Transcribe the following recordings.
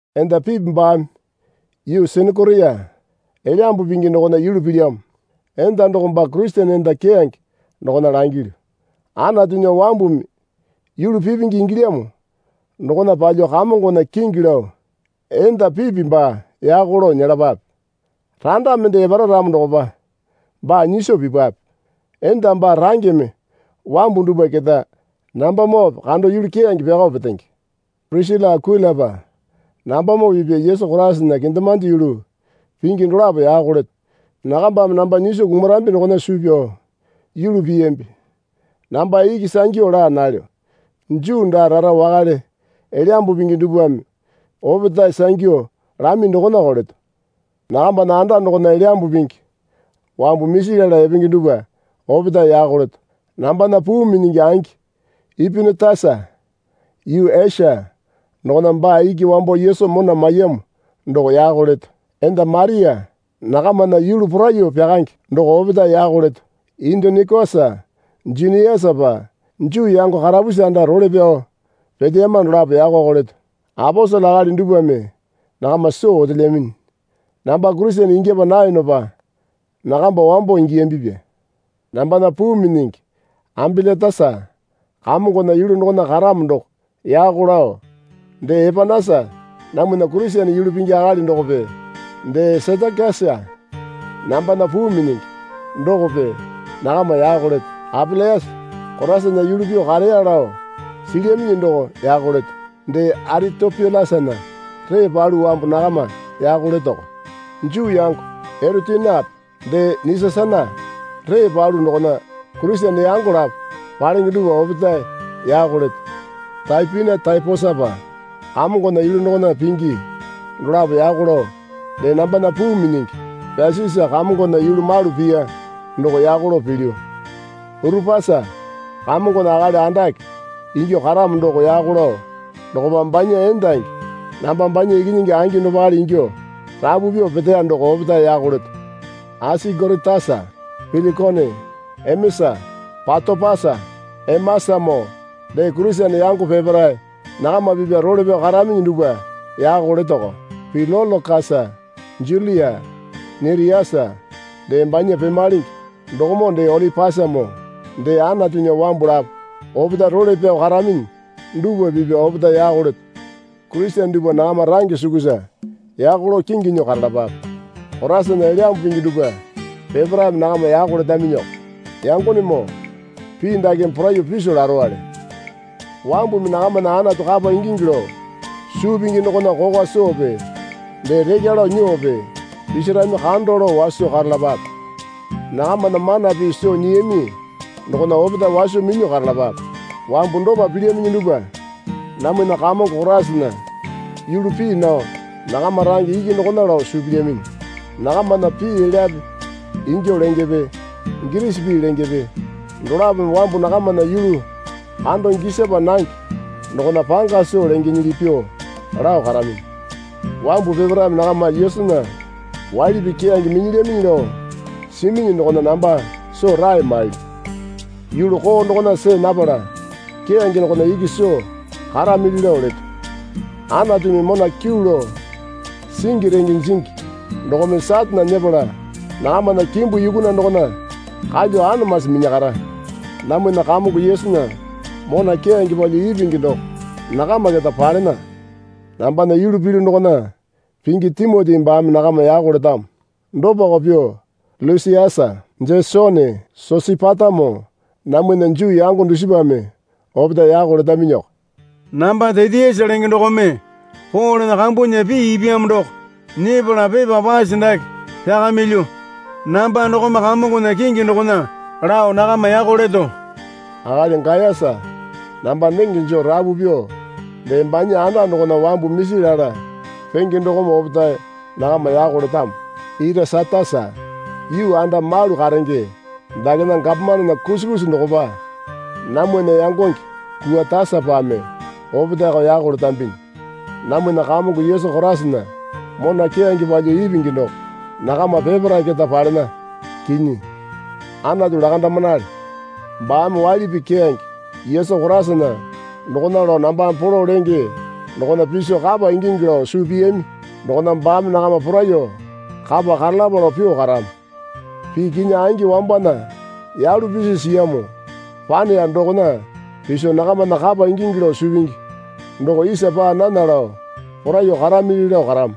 Enda Pipi baame yuu Senekoria Elyambu Pingi dokona yulu pilyamo. Enda doko baa Kurisene enda keyange dokona langilyu. Anatunya wambumi yulu pipingi ingilyamo dokona palyuo Kamongona kingi lao enda Pipi baa yako lao nyelapape. Randa mende epara ramo dokopa baa nyiso pipape. Enda baa rangeme wambu dupwa keta nambamoope kando yulu keyange pyakao petenge. Pirisila Akuilapa nambamoo pipya Yesu Koraisana kendemande yulu pingi dolapo yako leto. Nakambame namba nyiso kumarambi dokona suu pyao yulu piyambi. Namba iki sangyu laa nalyo. Juu daa rara wakale Elyambu Pingi dupwame opetae sangyu lami dokonako leto. Nakambana anda dokona Elyambu Pingi wambu misi lala epenge dupwa opetae yako leto. Nambana puu minyingi angi Epinitasa yuu Esia dokona baa iki wambo Yesu mona maiyamo doko yako leto. Enda Maria nakamana yulu poraiyuo pyakange doko opetae yako leto. Endonikosa Juniasapa Juu yango karapusi anda role pyao peteyama dolapo yakoko leto. Aposele akali dupwame nakama soo otelyaminyi. Namba Kurisene ingyapa nayonopa nakamba wambo ingiyambipya. Nambana puu minyingi Ambilatasa Kamongona yulu dokona karamo doko yako lao, dee Epanasa namwana Kurisene yulu pingi akali dokope dee Setekisa nambana puu minyingi dokope nakama yako leto. Apelesa Koraisana yulu pyuo kareya lao silyaminyi doko yako leto. Dee Aritopyulasana ree palu wambu nakama yako letoko. Juu yango Erotionape dee Nasisasana ree palu dokona Kurisene yango lapo palenge dupwa opetae yako leto. Taipina Taiposapa Kamongona yulu dokona pingi dolapo yako lao dee nambana puu minyingi Pesisa Kamongona yulu malu piya doko yako lao pilyu. Urupasa Kamongona akali andake ingyuo karamo doko yako lao dokopa banya endangi namba banya ikinyingi angi dopale ingyuo rapu pyuo peteya doko opetae yako leto. Asingoritasa Pilikone Emesa Patopasa Emasamoo dee Kurisene yango peparae nakama pipya role pyao karaminyi dupwa yako letoko. Pilolokasa Julia Neriasa dee banya pemalenge dokomoo dee Olipasamoo dee Anatunya wambu lapo opetae role pyao karaminyi dupwa pipya opetae yako leto. Kurisene dupwa nakama range sukusa yako lao kingi nyuo karalapape. Koraisana Elyambu Pingi dupwa peparaeme nakama yako letaminyiko. Yangonemoo, pii dakeme poraiyuo piso larowale. Wambumi nakamana Anatu kapa ingingi lao suu pingi dokona kokwa soope dee rekya lao nyuope pisirami kando lao waso karalapape. Nakamana mana pii soo nyiyami dokona opetae waso minyuo karalapape. Wambu dopa pilyaminyi dupwa namwana Kamongo Koraisana yulu pii nao nakama range iki dokona lao suu pilyaminyi. Nakamana pii elyape ingyuo lengepe girisi pii lengepe dolapome wambu nakamana yulu kando gisapa nange dokona panga soo lengenyili pyuo lao karaminyi. Wambu peparaeme nakama Yesunya waili pii keyange minyilyaminyi lao siminyi dokona namba soo rae mailyu. Yulu koo dokona see napala keyange dokona iki soo karamili lao leto. Anatumi mona kyuu lao singi renge jingi dokome Satane nyepala nakamana kimbu yukuna dokona kalyuo anamasi minyakara. Namwana Kamongo Yesunya mona keyange palyuo ipingi doko nakama keta palena. Nambana yulu pilyu dokona pingi Timoti baame nakama yako letamo. Dopako pyuo Lusiasa Jesone Sosipatamoo namwana Juu yango dusipame opetae yako letaminyiko. Namba Tetiasa lenge dokome Polena kambunya pii ipyamo doko nyepala pepa pase dake pyakamilyu. Namba dokome Kamongona kingi dokona lao nakama yako leto. Akali Gayasa namba nenge joo rapu pyuo dee banya anda dokona wambu misi lala penge dokome opetae nakama yako letamo. Irasatasa yuu anda malu karenge dakena gapomanena kusi kusi dokopa namwana yangonge Kuatasapame opetaeko yako letambinyi. Namwana Kamongo Yesu Koraisana mona keyange palyuo ipingi doko nakama peparae keta palena. Kinyi. Anatu lakandamanale. Baame waili pii keyange Yesu Koraisana dokona lao nambame polo lenge dokona piso kapa ingingi lao suu piyami dokona baame nakama poraiyuo kapa karalapa lao pyuo karamo. Pii kinyi angi wambana yalu pisi siyamo paneya dokona piso nakamana kapa ingingi lao suu pingi doko isa paa nana lao poraiyuo karamili lao karamo.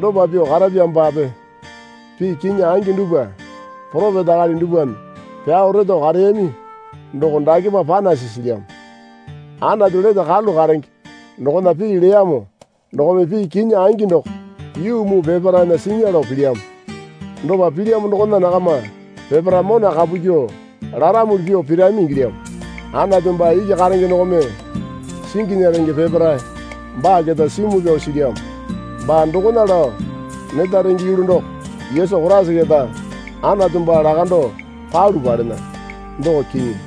Dopa pyuo karapyamopape pii kinyi angi dupwa poropeta akali dupwame pyao reto kareyami doko dakepa panasi silyamo. Anatu lete karalu karenge dokona pii leyamo dokome pii kinyi angi doko yuu muu peparaena sinya lao pilyamo. Dopa pilyamo dokona nakama peparae mona kapu kyuo laramuli pyuo pirami ingilyamo. Anatu baa iki karenge dokome singinya renge peparae baa keta simu pyao silyamo. Baa dokona lao neta renge yulu doko Yesu Koraisa keta Anatu baa lakando palu palena, doko kinyi.